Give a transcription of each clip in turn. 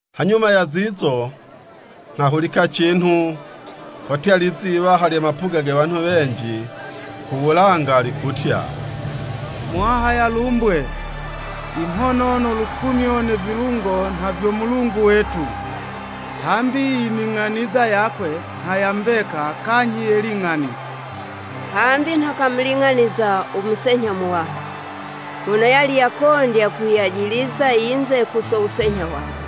Hanyuma ya zizo, nghahulika cinhu, kotya lizi yiwaha lye mapuga ge wanhu wenji ku wulanga, likutya, “Muwaha yalumbwe! I mhono no lukumyo, ne vilungo, nha vyo Mulungu wetu! Hambi ining'aniza yakwe nha ya mbeka kanyhi ye ling'ani. Hambi nha kamuling'aniza u musenyha muwaha, mono yali yakondya kuyajiliza yinze ku so wusenyha wakwe.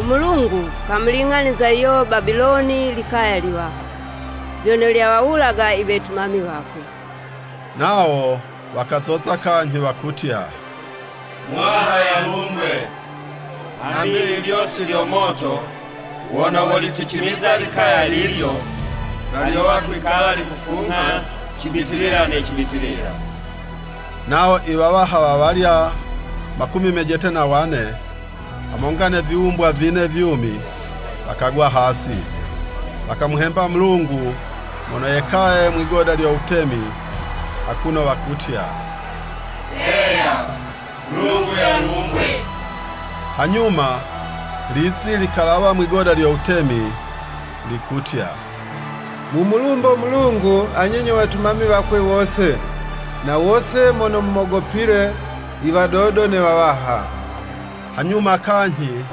U Mulungu kamuling'aniza yuyo Babiloni likaya liwaha, vyono lyawawulaga i wetumami wakwe!” Nawo wakazoza kanyhi wakutya, “Muwaha yalumbwe! Hambi i lyosi lyo moto wono woliticimiza likaya lilyo, nha lyowa kwikala likufungha cibitilila ne cibitilila!” Nawo i wawaha wawalya makumi mejete na wane, hamonga ne viwumbwa vine vyumi, wakagwa hasi, wakamuhemba Mulungu mono yekaye mwigoda lyo wutemi, akuno wakutya, “Heya! Mulungu yalumbwe!” Hanyuma lizi likalawa mwigoda lyo wutemi, likutya, “Mumulumbo Mulungu anye nyo wetumami wakwe wose, na wose mono mumogopile, i wadodo ne wawaha.” Hanyuma kanyhi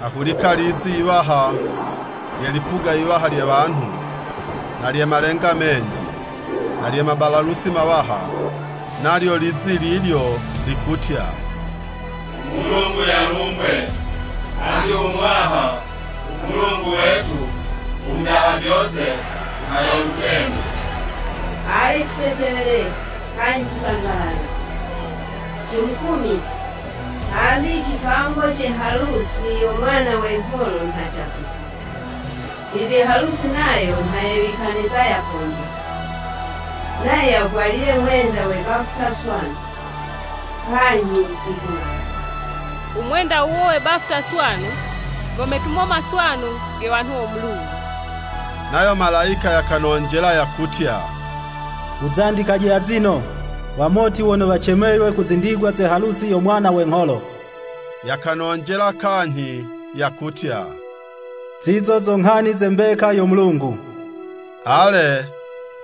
nghahulika lizi yiwaha lye lipuga yiwaha lye wanhu, na lye malenga menji, na lye mabalalusi mawaha, nalyo lizi lilyo likutya, “U Mulungu yalumbwe! Hambi u Muwaha, u Mulungu wetu, u Mudaha vyose, nha yo Mutemi! Ale cisecelele kanyhi cisangalale, cimukumye, hambi i cipango ce halusi yo Mwana we ngholo nha cafika, bibi halusi nayo nha yewikaniza yakondya. Nayo yavwalile mwenda we bafuta swanu, kanyhi yikung'alala!” (U mwenda wuwo we bafuta swanu go metumo maswanu ge wanhu wo Mulungu.) Nayo malayika yakanonjela yakutya, “Wuzandikaje azino, Wamoti wono wacemeywe ku zindigwa ze halusi yo Mwana we ngholo!” Yakanonjela kanyhi yakutya, “Zizo zo nghani ze mbeka yo Mulungu.” Ale,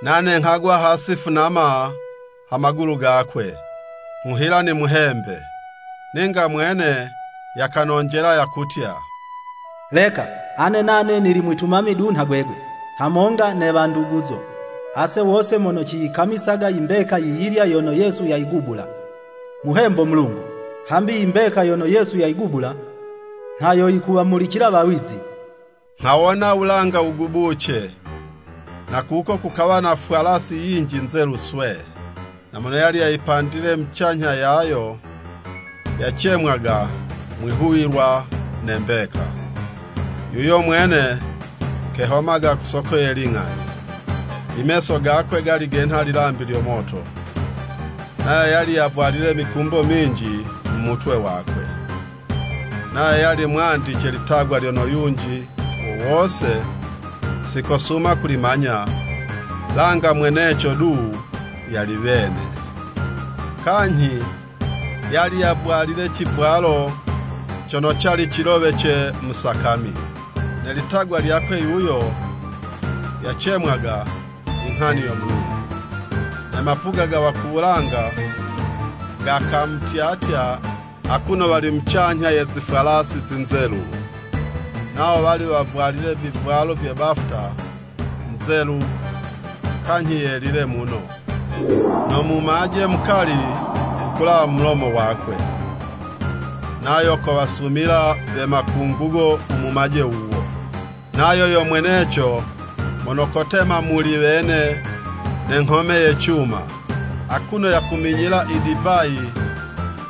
nane nghagwa hasi funama ha magulu gakwe, nghuhila nimuhembe. Ninga mwene yakanonjela yakutya, “Leka! Ane nane nili mwitumami du nha gwegwe, hamonga ne wanduguzo, ase wose mono ciyikamisaga i mbeka yiyilya yono Yesu yayigubula. Muhembo Mulungu!” Hambi i mbeka yono Yesu yayigubula, nha yo yikuwamulicila wawizi. Nghawona wulanga wugubuce, na kuko kukawa na fwalasi yinji nzelu swee, na mono yali yapandile mucanyha yayo, yacemwaga “Mwihuwilwa”, ne “Mbeka”. Yuyo mwene kehomaga ku soko ye ling'ani. I meso gakwe gali genha lilambi lyo moto, nayo yali yavwalile mikumbo minji mu mutwe wakwe. Nayo yali mwandice litagwa lyono yunji wo wose si kosuma kulimanya, langa mweneco du yali wene. Kanyhi yali yavwalile civwalo cono cali cilowece mu sakami. Ne litagwa lyakwe yuyo yacemwaga, “I nghani yo Mulungu.” Ne mapuga ga wa ku wulanga, gakamutyatya akuno wali mucanyha ye zifwalasi zinzelu, nawo wali wavwalile vivwalo vye bafuta nzelu, kanyhi yelile muno. No mumaje mukali wukulawa mu mulomo wakwe, nayo kowasumila, we makungugo, u mumaje wuwo. Nayo yo mweneco mono kotema muli wene ne nghome ya cuma, akuno yakuminyila idivayi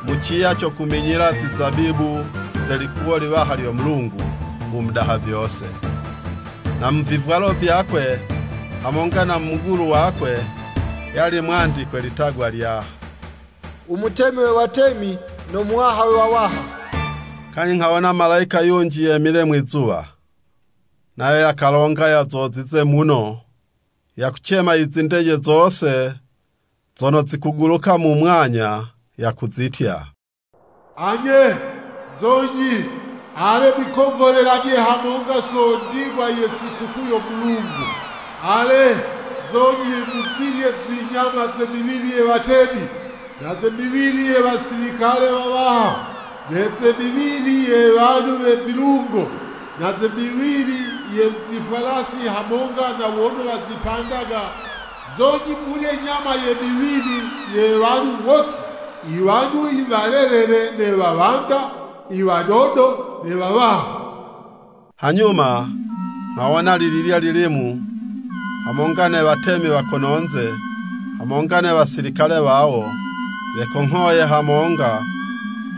mu ciya co kuminyila zizabibu ze likuwo liwaha lyo Mulungu u Mudaha Vyose. Na mu vivwalo vyakwe hamonga na mu mugulu wakwe, yali mwandikwe litagwa lya, “U Mutemi we watemi, no Muwaha we wawaha.” Kanyhi nghawona malayika yunji yemile mwizuwa. Nayo yakalonga yazozize muno, yakucema i zindeje zose zono zikuguluka mu mwanya, yakuzitya, “Anye, nzonyi! Ale mwikongholelaje hamonga so ndigwa ye sikukuu yo Mulungu. Ale, nzonyi muzilye zi nyama ze miwili ye watemi, na ze miwili ye wasilikale wawaha, ne ze miwili ye wanhu we vilungo, na ze miwili ye zifwalasi hamonga na wono wazipandaga, nzonyi mulye nyama ye miwili ye wanhu wose, i wanhu i walelele ne wawanda, i wadodo ne wawaha.” Hanyuma nghawona lililya lilimu, hamonga, ne watemi wa kono'nze, hamonga ne wasilikale wawo, wekonghoye hamonga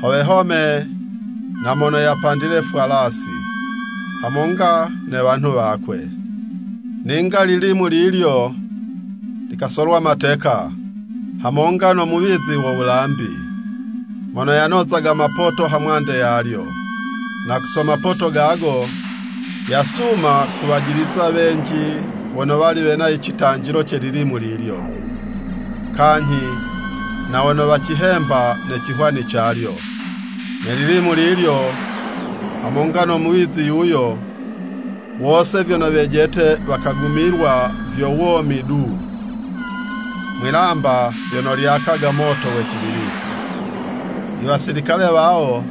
ho wehome na mono yapandile fwalasi, hamonga ne wanhu wakwe. Ninga lilimu lilyo likasolwa mateka, hamonga no muwizi wo wulambi, mono yanozaga mapoto ha mwande yalyo. (Na ku so mapoto gago, yasuma kuwajiliza wenji wono wali wena i citanjilo ce lilimu lilyo, kanyhi na wono wacihemba ne cihwani calyo.) Ne lilimu lilyo hamonga no muwizi yuyo, wose vyono wejete, wakagumilwa vyo womi du, mwilamba lyono lyakaga moto we cibiliti. I wasilikale wawo,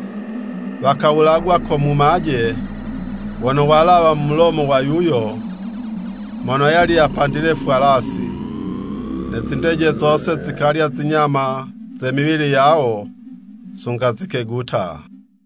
wakawulagwa ko mumaje wono walawa mu mulomo wa yuyo mono yali yapandile fwalasi. Ne zindeje zose zikalya zinyama ze miwili yawo sunga zikeguta.